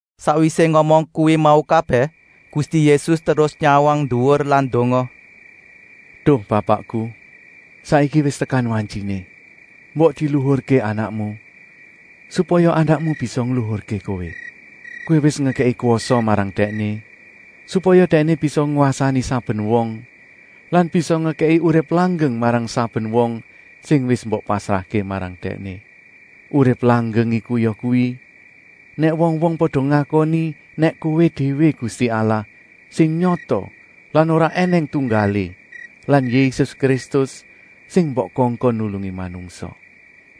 Sakwisé ngomong kuwi mau kabèh Gusti Yésus terus nyawang nduwur lan ndonga: “Duh Bapakku, saiki wis tekan wantyiné. Mbok diluhurké Anakmu, supaya Anakmu bisa ngluhurké Kowé. Kowé wis ngekèki kwasa marang Dèkné, supaya Dèkné bisa ngwasani saben wong lan bisa ngekèki urip langgeng marang saben wong sing wis mbok pasrahké marang Dèkné. Urip langgeng iku yakuwi: nèk wong-wong pada ngakoni nèk Kowé déwé Gusti Allah sing nyata lan ora ènèng tunggalé lan Yésus Kristus, sing mbok kongkon nulungi manungsa.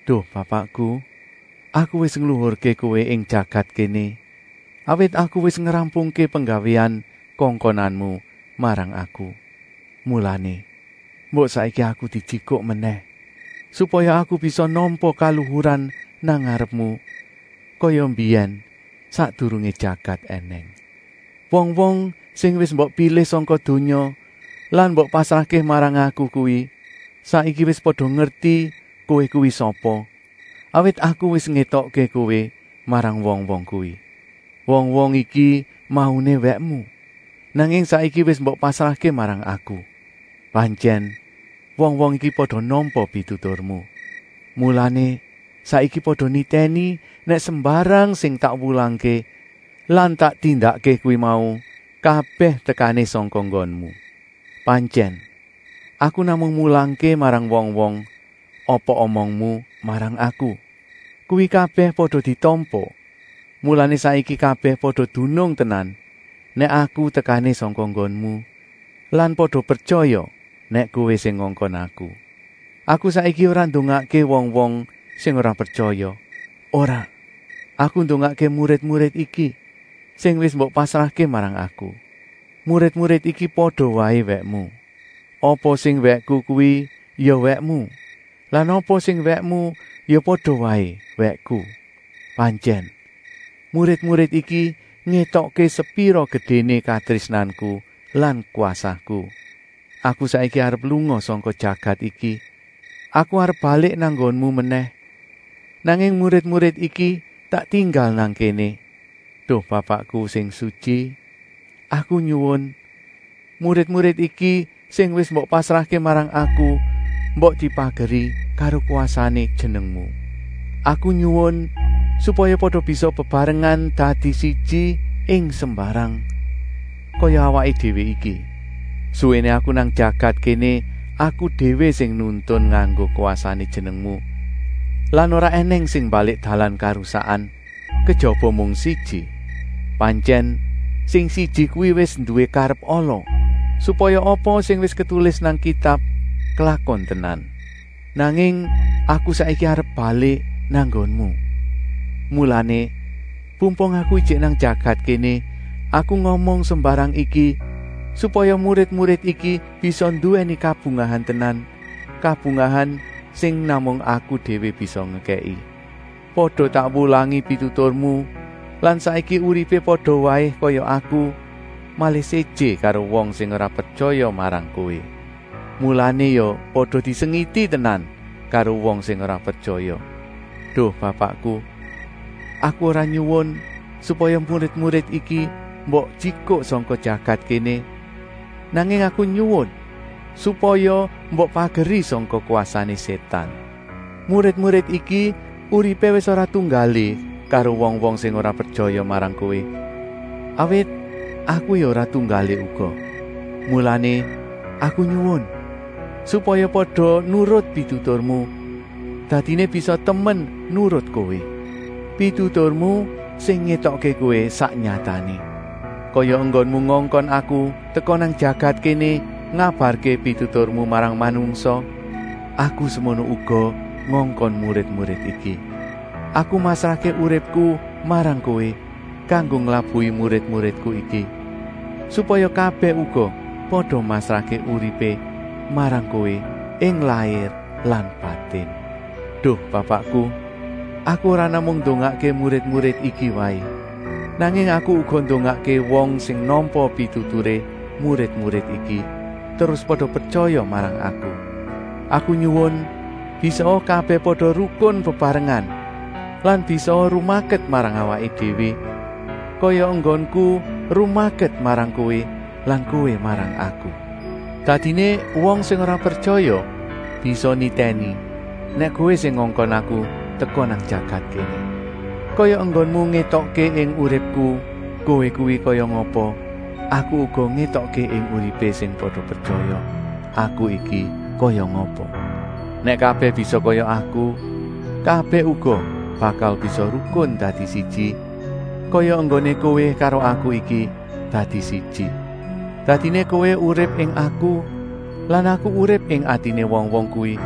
Duh Bapakku, Aku wis ngluhurké Kowé ing jagat kéné, awit Aku wis ngrampungké penggawéan kongkonanmu marang Aku. Mulané, mbok saiki Aku dijikuk menèh, supaya Aku bisa nampa kaluhuran nang ngarepmu, kaya mbiyèn sakdurungé jagat ènèng. “Wong-wong sing wis mbok pilih sangka donya lan mbok pasrahké marang Aku kuwi saiki wis pada ngerti Kowé kuwi sapa, awit Aku wis ngétokké Kowé marang wong-wong kuwi. Wong-wong iki mauné wèkmu, nanging saiki wis mbok pasrahké marang Aku. Pantyèn wong-wong iki pada nampa pituturmu. Mulané saiki pada nitèni nèk sembarang sing tak wulangké lan tak tindakké kuwi mau kabèh tekané sangka nggonmu. Pantyèn, Aku namung mulangké marang wong-wong apa omongmu marang Aku. Kuwi kabèh pada ditampa, mulané saiki kabèh pada dunung tenan nèk Aku tekané sangka nggonmu lan pada pretyaya nèk kowé sing ngongkon Aku. “Aku saiki ora ndongakké wong-wong sing ora pretyaya, ora, Aku ndongakké murid-murid iki, sing wis mbok pasrahké marang Aku. Murid-murid iki pada waé wèkmu. Apa sing wèkku kuwi ya wèkmu lan apa sing wèkmu ya pada waé wèkku. Pantyèn, murid-murid iki ngétokké sepira gedéné katrésnanku lan kwasaku. Aku saiki arep lunga sangka jagat iki, Aku arep balik nang nggonmu menèh, nanging murid-murid iki tak tinggal nang kéné. Duh Bapakku sing sutyi, Aku nyuwun, murid-murid iki sing wis mbok pasrahké marang Aku, mbok dipageri karo kwasané jenengmu. Aku nyuwun supaya pada bisa bebarengan dadi siji ing sembarang, kaya Awaké Déwé iki. Suwéné Aku nang jagat kéné Aku déwé sing nuntun nganggo kwasané jenengmu lan ora ènèng sing mbalik dalan karusakan, kejaba mung siji. Pantyèn sing siji kuwi wis nduwé karep ala, supaya apa sing wis ketulis nang Kitab klakon tenan. Nanging Aku saiki arep balik nang nggonmu. Mulané, pumpung Aku ijik nang jagat kéné Aku ngomong sembarang iki, supaya murid-murid iki bisa nduwèni kabungahan tenan, kabungahan sing namung Aku déwé bisa ngekèki. Pada tak wulangi pituturmu lan saiki uripé pada waé kaya Aku, malih séjé karo wong sing ora pretyaya marang Kowé. Mulané ya pada disengiti tenan karo wong sing ora pretyaya. Duh Bapakku, Aku ora nyuwun supaya murid-murid iki mbok jikuk sangka jagat kéné, nanging Aku nyuwun supaya mbok pageri sangka kwasané Sétan. Murid-murid iki uripé wis ora tunggalé karo wong-wong sing ora pretyaya marang kowé, awit Aku ya ora tunggalé uga. Mulané Aku nyuwun, supaya pada nurut pituturmu, dadiné bisa temen nurut Kowé. Pituturmu sing ngétokké Kowé sak nyatané. Kaya enggonmu ngongkon Aku teka nang jagat kéné ngabarké pituturmu marang manungsa, Aku semono uga ngongkon murid-murid iki. Aku masrahké uripku marang Kowé kanggo nglabuhi murid-muridku iki, supaya kabèh uga pada masrahké uripé marang Kowé ing lair lan batin. “Duh Bapakku, Aku ora namung ndongakké murid-murid iki waé, nanging Aku uga ndongakké wong sing nampa pituturé murid-murid iki terus pada pretyaya marang Aku. Aku nyuwun bisaa kabèh pada rukun bebarengan lan bisaa rumaket marang Awaké Déwé, kaya enggonku rumaket marang Kowé lan Kowé marang Aku. Dadiné wong sing ora pretyaya bisa nitèni nèk Kowé sing ngongkon Aku teka nang jagat kéné. Kaya enggonmu ngétokké ing uripku Kowé kuwi kaya ngapa, Aku uga ngétokké ing uripé sing pada pretyaya, Aku iki kaya ngapa. Nèk kabèh bisa kaya Aku, kabèh uga bakal bisa rukun dadi siji kaya enggoné Kowé karo Aku iki dadi siji. Dadiné Kowé urip ing Aku lan Aku urip ing atiné wong-wong kuwi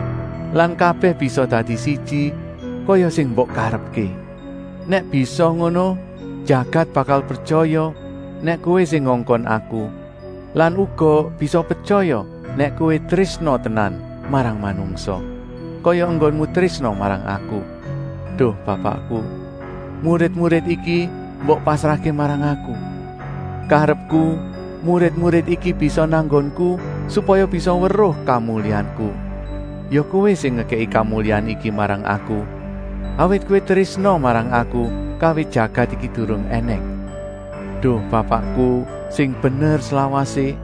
lan kabèh bisa dadi siji, kaya sing mbok karepké. Nèk bisa ngono jagat bakal pretyaya nèk Kowé sing ngongkon Aku lan uga bisa pretyaya nèk Kowé trésna tenan marang manungsa, kaya enggonmu trésna marang Aku. “Duh Bapakku, murid-murid iki mbok pasrahké marang Aku. Karepku murid-murid iki bisa nang nggonku, supaya bisa weruh kamulyanku. Ya Kowé sing ngekèki kamulyan iki marang Aku, awit Kowé trésna marang Aku kawit jagat iki durung ènèng. Duh Bapakku sing bener slawasé,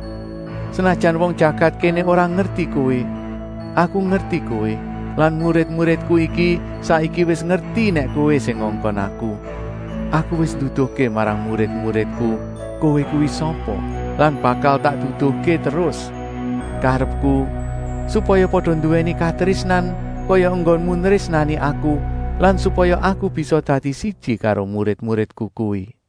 senajan wong jagat kéné ora ngerti Kowé, Aku ngerti Kowé lan murid-muridku iki saiki wis ngerti nèk Kowé sing ngongkon Aku. Aku wis nduduhké marang murid-muridku Kowé kuwi sapa lan bakal tak duduhké terus. Karepku, supaya pada nduwèni katrésnan kaya enggonmu nrésnani Aku lan supaya Aku bisa dadi siji karo murid-muridku kuwi.”